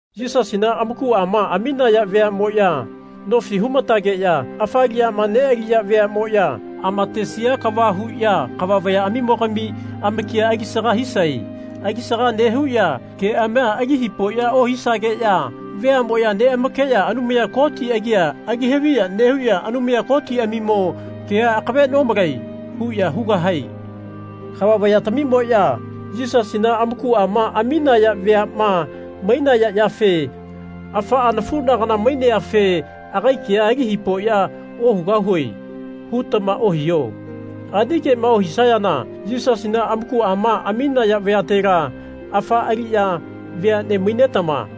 Yisasina amakuama aminaya veamoya, nofi humatageya afa aliyama nealiya veamoya, amatesia kava huya kava vayaamimo-gami amakia alisaga hisae. Alisaga nehuya keamia ali hipoya ohisageya veamoya neamakeya Anumaya Koti agia ali haviya nehuya Anumaya Kotiamimo kea akave nomalae. huya hugahae. Kava vayatamimoya Yisasina amakuama aminaya veama mainaya yafe Afaa nafunagana maineafe agai kea ali hipoya ohugahue. hutama ohiho. Ani kema ohisayana Yisasina amakuama aminaya vayatela afa aliya veane mainetama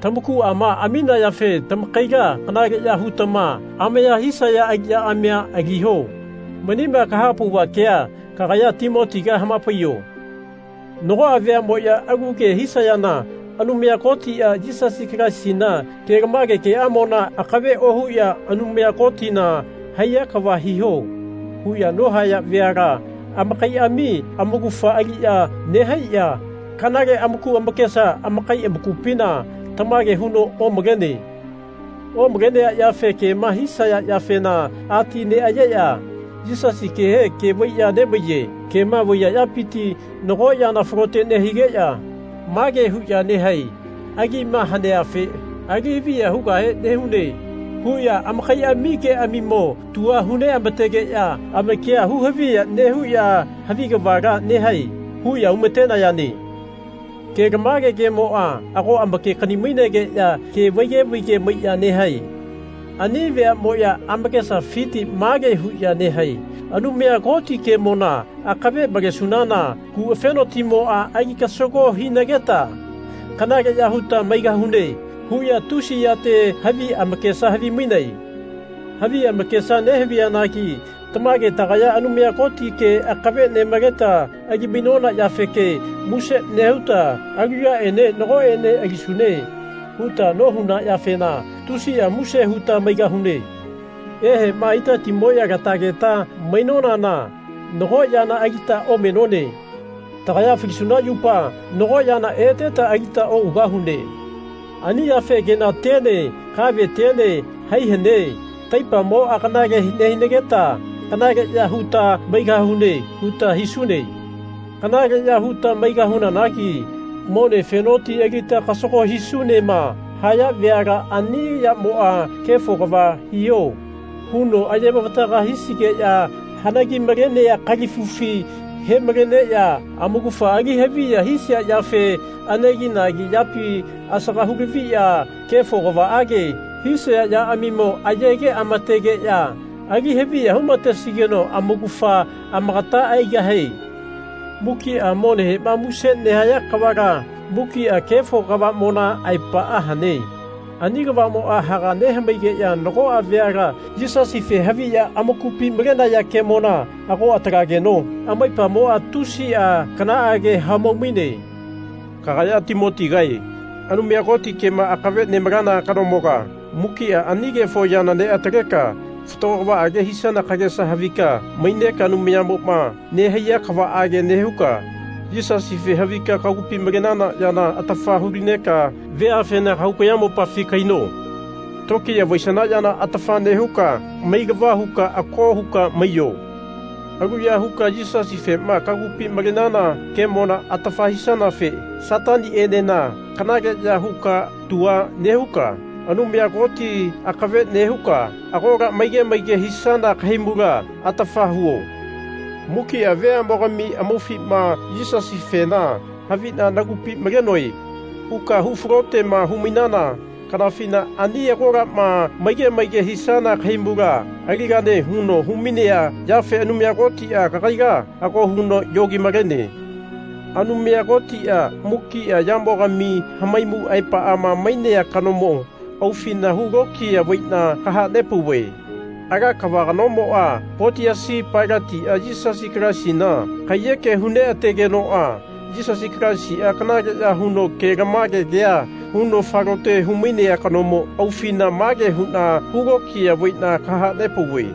tamakuama aminayafe tamakaila kanaleya hutama amaya hisaya aliyaamia aliho. Manima kahapauva kea kagaya Timotiga hamapaiyo. Nagoa veamoya alu ke hisayana Anumayatia Yisasi Kalaisina kelamage keamona akave ohuya Anumaya Kotina haiya kava hiho. huya nohaya veala amakaiami amaugafa aliya nehaiya kanale amaku amakesa amakai amakupina tamage huno omalene. Omalenea yafe kema hisaya yafena ati neayeya Yisasi kehe ke vaiya nemaiye. Kema vaiya yapiti nago yana falote nehigeya mage huya nehae Agima haneafe ali haviya hugahe nehune. huya amakaiami keamimo tua hu neamategeya amakia hu haviya nehuya Havi kavala nehae. huya humatenayane. Kelamage kemoa ago amakekani-mainegeya kea vaige vaige maiya nehae. Ani veamoya amakesafiti mage huya nehae Anumaya Koti kemona akave malesunana kuafenotimoa ali kasago hinageta kanaleya huta maigahune. huya tusi yate havi amakesa havimainae. Havi amakesa nehaviyanagi tamage tagaya Anumaya Koti ke akave nemaleta ali-mainona yafeke muse nehuta Alu yaenena nagoene alisune. huta nohuna yafena tusia muse huta maigahune. Ehema itatimoya latageta mainonana nago yana alita omenone. Tagaya falisuna yupa nago yana eteta alita ougahune. Ani yafe Kenatiene kavetiene hai hane. Taipamoa kanale nehinageta kanaleya huta maigahune. huta hisune. Kanaleya huta maigahunanagi Mone afenoti alita kasago hisunema. haya veala ani yamoa Kefo kava hiho. huno aye-mavataga hisigeya hanagimalenea kalifufi hemaleneya amaugafa ali haviya hisia yafe aneginagi yapi asaga hulaviya kefo kavaage hisaya yaamimo ayegeamategeya ali haviya humatesigeno amaugafa amakata aigahie. Mukia monehema muse nehaya kavala mukia kefo kavamona aepaa hane. Ani kavamoa haga nehamaigeya nagoa veala Yisasife haviya amakupi malenaya kemona ago atalageno amaipamoa tusia kanaage hamau-maine. Kagaya Timotigae Anumaya Koti kema akave nemalana kanomoga mukia ani kefo yana neataleka fatago kavaage hisana kagesa havika maineka Anumayamoma nehaiya kavaage nehuka Yisasife havika kagupi malenana yana atafa hulineka veafena kahau kayamopafi kahaino. Tokiya vaisana yana atafa nehuka mailava huka ako huka maiyo. Aluya huka Yisasifema kagupi malenana kemona atafa hisanafe Satanienena kanaleya huka tua nehuka Anumaya Koti akave neuka agola maige maige hisana kahaimula atafa huo. Mukia veamogami amaufima Yisasifena havina nagupi malenoe. huka hu falotema humainana kanafina ani agolama maige maige hisana kahaimula aligane huno humainea yafe Anumaya Kotia kagaila ago huno yogi-malene. Anumaya Kotia mukia yamogami hamaimu aepama mainea kanomo aufina hulokiya vaina kahanepauve. Ala kava kanomoa Potiasi Pailatia Yisasi Kalaisina kaiyekema hu neategenoa Yisasi Kalaisia kanaleya huno kelamage kea huno falote humainea kanomo aufina mage huna hulokiya vaina kahanepauve.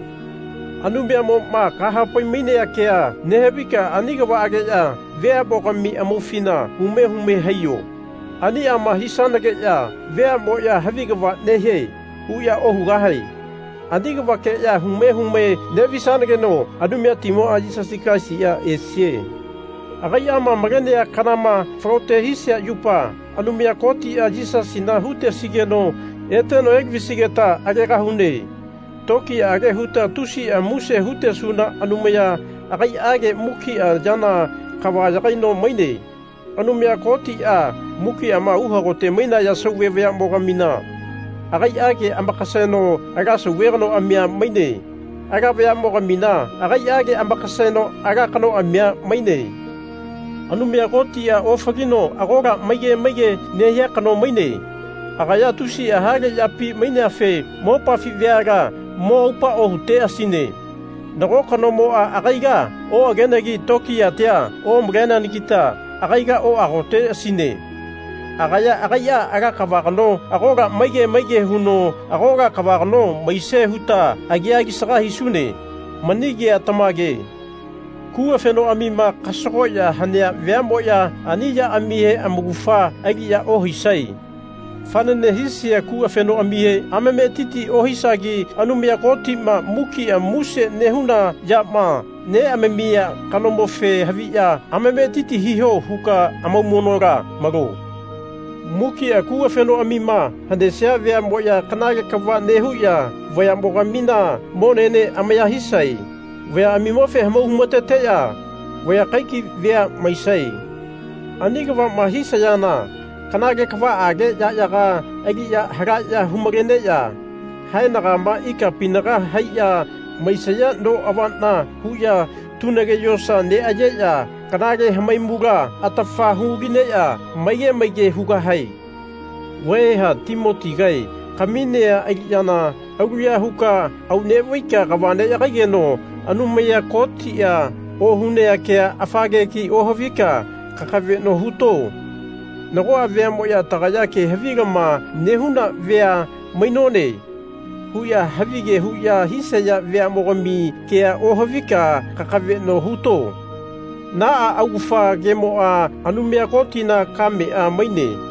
Anumaya-moma kahapai-mainea kea nehavika ani kavaageya veamogami amaufina hume hume haiyo. Aniama hisanageya veamoya Havi kava nehie. huya ohugahae. Ani kavakeya hume hume nevisanageno Anumayatimoa Yisasi Kalaisia esie. Agaiama malenea kanama falote hisia yupa Anumaya Kotia Yisasina hutesigeno eteno elavisigeta agegahune. Tokiyaage huta tusia muse hutesuna Anumaya agaiage mukia yana kava yagaino maine. Anumaya Kotia mukiama uhagote mainaya sauve vayamo-gamina agaiage amakaseno ala sauve kanoamia maine. Ala vayamogamina agaiage amakaseno ala kanoamia maine. Anumaya Kotia ofalino agola maige maige nehia kano maine. Agaya tusia hale yapi maineafe mopafi veala mo aupa ohuteasine. Nago kanomoa agaila oagenegi tokiyatia omaleneanagita agaila oagoteasine. Agaya agaia ala kava kano agola maige maige huno agola kava kano maisie huta agia alisaga hisune. Mani kea tamage. Kuafenoamima kasagoya hanea veamoya ani yaamihe amaugafa aliya ohaisae. Fanane hisia kuafenoamihe amametiti ohisagi Anumaya Kotima mukia muse nehuna yama neamamia kanomofe haviya amametiti hiho huka amaumonola malo. Mukia kuafenoamima hanesia veamoya kanale kava nehuya vayamogamina monene amaya hisae. Vayaamimofe hamau humateya vaya kaikai vea maisae. Ani kavama hisayana kanale kavaage yayaga aliya halaya hu-maleneya haenagama ikapinaga haiya maisaya no avana huya tunage yosa neayeya kanale hamaimula atafa hu-lineya maige maige hugahae. Vaeha Timotigae kaminea aliyana aluya huka aunevaika kava neyagaigeno Anumaya Kotia ohunea kea afa kegi ohavika kakaveno huto. Nagoa veamoya Tagaya ke havilama nehuna vea mainone. huya havige huya hisaya veamogami kea ohavika kakaveno huto. Naa augafa kemoa Anumaya Kotina kamea maine.